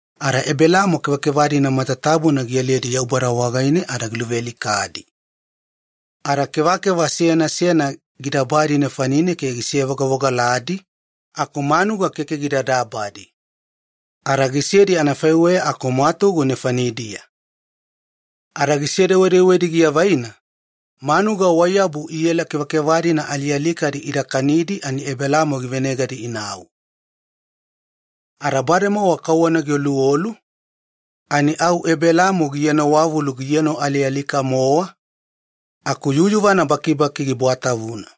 Ada Ebelamo kevakeva-dina matatabuna gialiyedi Yaubada wagaine, wadedeku giluvealikadi ada toiye gidabalugedi ke gisevogavogaladi, aku manuga ani keke gida dabalugedi. Ada gisedi anafaiweya aku mwatugu nefanidiya. Ada gisedewedewedi giavaina, muliya manuga waiyabu iela kevakeva alialikadi ida kanidi ani Ebelamo givenegadi inau. Ada bademowa kauwana gioluolu, ani au Ebelamo gienowavulu gienoalialika-mowa, aku yuyuvana bakibaki gibwatavuna.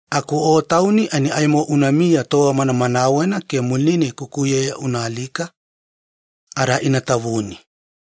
Aku o tauni fainiya ani aimo unamiya tova manamanawena ke muline kukuyeya unaalika ada ina tavuni.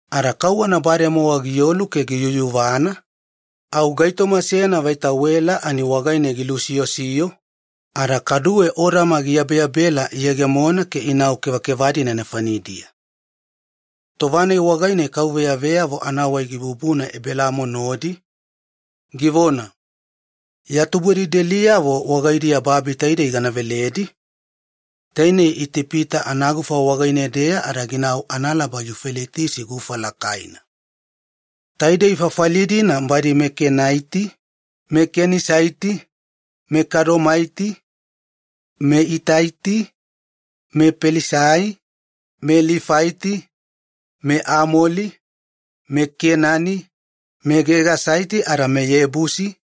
Ada kauwana bademowa giolu ke giyuyuvana, au gaitoma seyana vaita wela ani wagaine gilusiyosiyo ada odama giyabeyabela giyegemona ke ginau kevakeva-dina nefanidiya. Tova-nai wagaine Yaubada veyavo anavona dabadaba gibubuna Ebelamo wagaine, givona, “Ya tubudelideliyavo wagaidiya babi taidei gana veledi, tainei Itipita anagufa wagaine-deya ada ginau analaba Yufaleitisi gufa lakaina. Taidei fafali-dina badi meKenaiti, meKenisaiti, meKadomaiti, meItaiti, mePelisaiti, meLifaiti, meAmolaiti, meKenani, meGegasaiti ada meYebusi,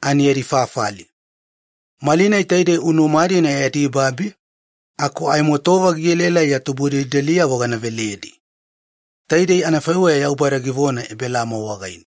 ani yadi fafali. Malinai taidei unuma-dina yadi babi, aku aimo tova gielaelai ya tubudelideliyavo gana veledi.” Taidei anafaiweya Yaubada givona Ebelamo wagaine.